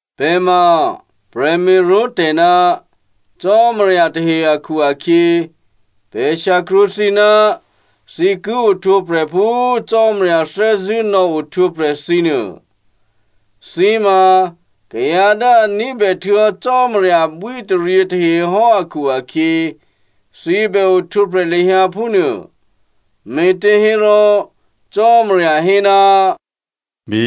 Pè̤ ma prè̤me̤ró̤tè̤ ná Cò́marya tahe akhu-akhyě, pè̤ shyakrwǒ thǐ ná thǐ ki ohtwǒprè̤ phú Cò́marya thè́zṳ̂́ nò̌ohtwǒprè̤ thǐnuô. Thǐ ma kayǎ dố a ní̤bè htuô̌hò́ Cò́marya abwíataryě tahe hò́ akhu-akhyě, thǐ bè ohtwǒprè̤ lahyǎ phúnuô. Me̤těhérò Cò́marya hé, “Bí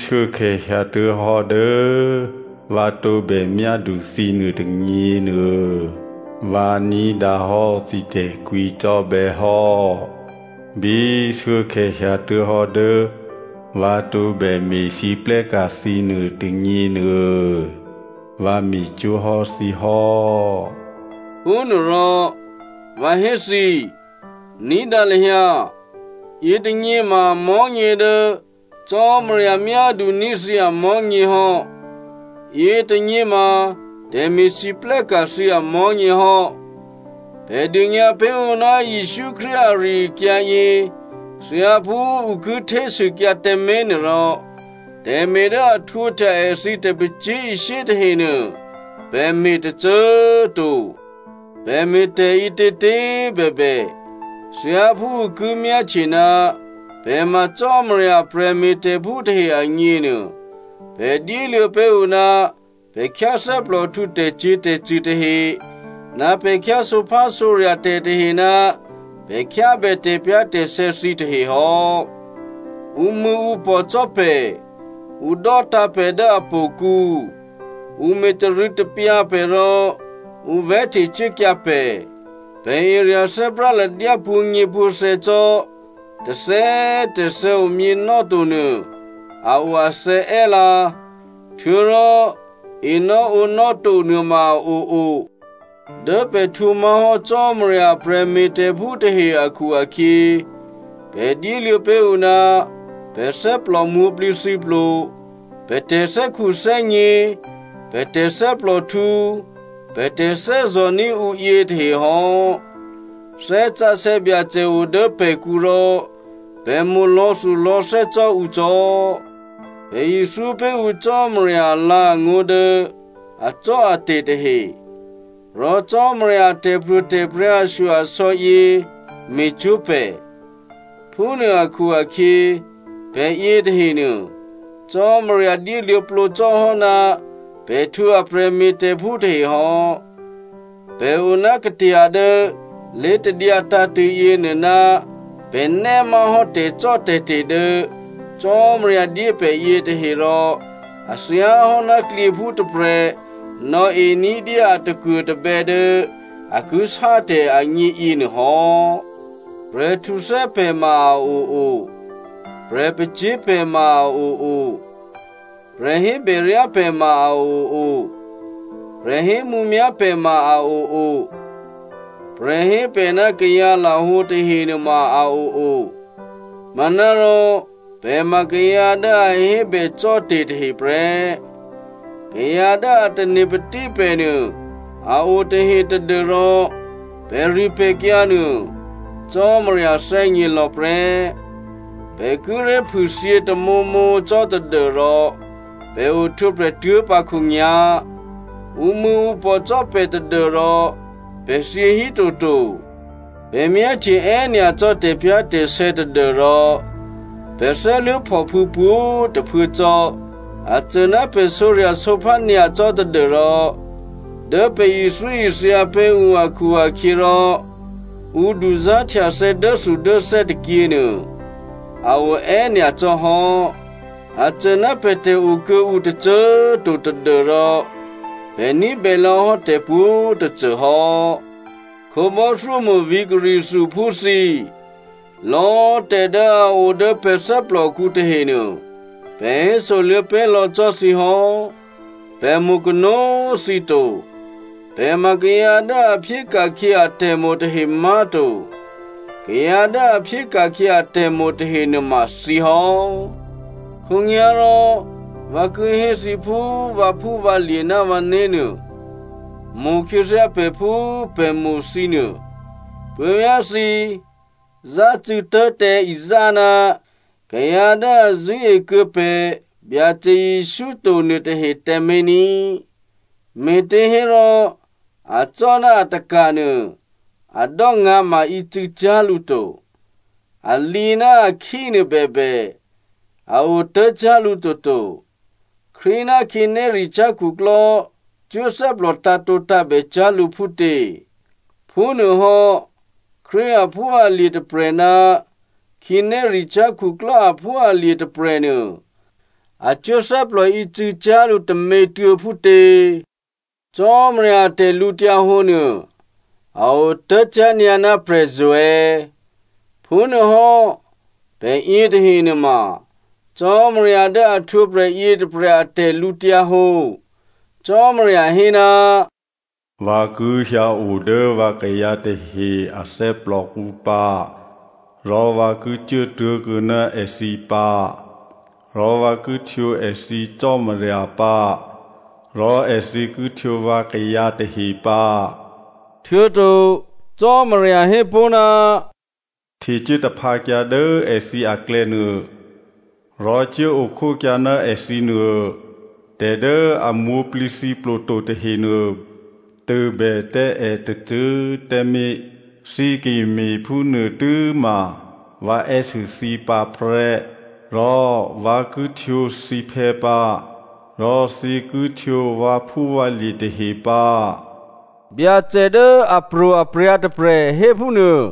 shuốkhè̌ hyǎtuố̤hò́ dố vǎ tǒbè myádu thǐ nuôtônyěnuô, vǎ ní̤dǎhò́ thǐ tè̤kwǐcò́bè̌ hò́, bí shuốkhè̌ hyǎtuố̤hò́ dố vǎ tǒbè me̤lwóhteka̤ thǐ nuôtônyěnuô, vǎ me̤cwó̤ hò́ thǐ hò́.” Phúnuôrò, vǎ hé thǐ, ní̤dǎ lahyǎ, yětônyě ma mò̤́nyě dố Cò́marya myáduní̤ thǐ amò̤́nyě hò́. Yětônyě ma tè̤me̤lwóhteka̤ thǐ amò̤́nyě hò́. Pè̤ dônyǎ pé̤ ǔ ná Jesǔ Krístu ari-akyǎ yě thyáphú ǔ ki htésûkyǎ tǎmé̤ nuôrò, tè̤me̤ dố a htwǒhtya èthǐ tè̤pacyé̤ishyé tahenuô pè̤ me̤ tôcô꤮ to. Pè̤ me̤ tè̤ ǐtětě꤮ bèbè, thyáphú ǔ ki myáhtye ná pè̤ ma Cò́marya a prè̤me̤tè̤phú tahe agněnuô, pè̤ dyéluô̌ pé̤ ǔ ná pè̤ khyáthè́plòhtǔ tè̤cyě̤tè̤cṳ̂ tahe, ná pè̤ khyá sǒphásǒrya̤ tè̤tahe ná pè̤ khyábè tè̤pyá̤tè̤sè̌ thǐtahe hò́. Ǔmṳ̂̌ǔpò̤ cò́ pè̤. Ǔ dò́tǎ̤ pè̤ dố htò̌kǔ. Ǔ me̤ tarû̌tapyǎ pè̤ rò ǔ vè̤́htecuốkyǎ pè̤, pè̤ erya̤ thè́práladyá pwǒ̤nyěpwǒ̤thè̌ cò́, tôthè̌꤮ tôthè̌ omyěnò́to nuô a o athè̌ è́ lǎ, htuô̌rò enò́ǒnò́ to nuôma a oo. Dố pè̤ htwǒ má̤hò́ Cò́marya a prè̤me̤tè̤phú tahe akhu-akhyě, pè̤ dyéluô̌ pé̤ ǔ ná pè̤ thè́plò mwǒ̤plǐthǐplo, pè̤ tè̤thè́khuthè́gně, pè̤ tè̤thè́plòhtǔ, pè̤ tè̤thè́zò̤ní̤ ǔ yětahe hò́. Thè́ Sǎsè̌ Byacè o dố pè̤kǔ rò pè̤ mo̤ lò̌thulò̌thè́ cò́ ǔ cò́. Pè̤ ithyó pé̤ ǔ Cò́marya alǎ̤angó̤ dố acò́ate̤ tahe, rò Cò́marya a tè̤pro̤tè̤prya̤ ashyo-asò̌ yě me̤cwó̤ pè̤. Phúnuô akhu-akhyě pè̤ yětahenuô Cò́marya dyéluô̌plǒ cò́ hò́ ná pè̤ htwǒ èprè̤me̤tè̤phú tahe hò́. Pè̤ o ná katya dố lé̤tadyǎ tǎ̤tṳ̂̌ yěnuô ná pè̤nè́ má̤hò́ tè̤cò́tè̤te̤ dố Cò́marya dyé pè̤ yětahe, rò a thyáhò́ ná klyěphú tôprè̤ nò̌e ní̤dyé a takuô̤tabè̌ dố a ki sátè̤ agně yěnuô hò́. Prè̤ htuthè́ pè̤ ma a oo, prè̤ pacyé̤ pè̤ ma a oo. Prè̤ hébèryá pè̤ ma a oo, prè̤ hémǔmyá̤ pè̤ ma a oo. Prè̤ hé pè̤ ná kayǎlahǒ tahe nuôma a oo, manárò pè̤ ma kayǎ dố a hébècò́ tè̤ tahe prè́. Kayǎ dố a tane̤patí pè̤ nuô a o tahe tadû́rò pè̤ripè̤kyǎ nuô, Cò́marya thè́gně lò̌ prè́. Pè̤ kíré̤ phûthyě tamǒmǒ cò́ tadû́rò pè̤ ohtwǒprè̤ tuố̤pǎ khǒnyá̤. Ǔmṳ̂̌ǔpò̤ cò́ pè̤ tadû́rò pè̤ thyě hí toto. Pè̤ myáhtye è́nyacò́ tè̤pyá̤tè̤sè̌ tadû́rò pè̤ thè́luố̤phòphû̌ pwǒ̤꤮ tôphuố cò́. A cô ná pè̤ sǒrya̤sǒphá nyacò́ tadû́rò dố pè̤ ithyóithya pé̤ ǔ akhu-akhyěrò ǔ duzá̤htyathè̌ dốthudốthè́ tôkyě nuô a o è́nyacò́ hò́. A cô ná pè̤tè̤ o kuô̌ǔ tôcô꤮ to tadû́rò pè̤ ní̤bè lò̌hò́ tè̤pwǒ̤꤮ tôcô hò́. Khǒbò́thyómo̤ vǐ̤ Corinthiaphú thǐ꤮, lò̌꤮ tè̤ dố a o dố pè̤ thè́plòkǔ tahenuô, pè̤ hésoluô̌ pé̤ lò̌ cò́ thǐ hò́. Pè̤ mo̤kanó꤮ thǐ to. Pè̤ ma kayǎ dố a phyéka̤khyě atè̤mo̤ tahe má̤to. Kayǎ dố a phyéka̤khyě atè̤mo̤ tahe nuôma thǐ hò́. Khǒnyá̤rò vǎ ki hé thǐ phú vǎphúvǎlye̤ ná vǎné̤ nuô. Mo̤khyěthyá pè̤ phú pè̤ mo̤ thǐ nuô. Puố̤vyá̤ thǐ, zácû̌ tố̤ tǎ izá ná kayǎ dố a zṳ̂́ekuô̌ pè̤ Byacè Jesǔ to nuôtahe tǎmé̤ ní꤮. Me̤těhérò acò́ ná ataka̤ nuô a dò́ngǎ̤ma ícû̌cyá̤ lǔ to. A lǐ ná a khí nuô bèbè, a otố̤cyá̤ lǔ toto. Krístu ná khǐnéricyá̤ khuklò́ cuố thè́plò tǎ̤tǒtǎ̤bè cyá̤ lǔ phútě? Phúnuôhò́ Krístu aphúalye̤ tôprè̤ ná khǐnéricyá̤ khuklò́ aphúalye̤ tôprè̤nuô a cuố thè́plò ícû̌cyá̤ lǔ tômětuô̌ phútě? Cò́marya a tè̤lǔhǒdu nuô a otố̤cyá̤ nyǎ ná prè̤zo̤ è̌. Phúnuôhò́, pè̤ yětahe nuôma Cò́marya dố a htwǒprè̤ yětôprè̤ a tè̤lǔhǒdu. Cò́marya hé, “Vǎ ki hyǎo dố vǎkayǎ tahe a thè́plòkǔ pǎ rò vǎ ki cuố tố̤kuô̌ ná èthǐ pǎ. Rò vǎ ki htwǒ èthǐ Cò́marya pǎ, rò èthǐ ki htwǒ vǎkayǎ tahe pǎ.” Htuô̌to Cò́marya hé pó̤, “Htecuố taphǎkyǎ dố èthǐ aklè̌nuô rò cuốo khókyǎ ná èthǐ nuô. Tè̤ dố a mwǒ̤plǐthǐplo to tahenuô tôbè tǎ è tôcô꤮ tǎmé̤, thǐ ki me̤phúnuô tû́ma vǎ è́sû thǐ pǎ prè́. Rò vǎ ki htwǒ thǐphè̌ pǎ. Rò thǐ ki htwǒ vǎphúvǎlye̤ tahe pǎ,” Byacè dố apro̤aprya̤ tôprè̤ hé phúnuô.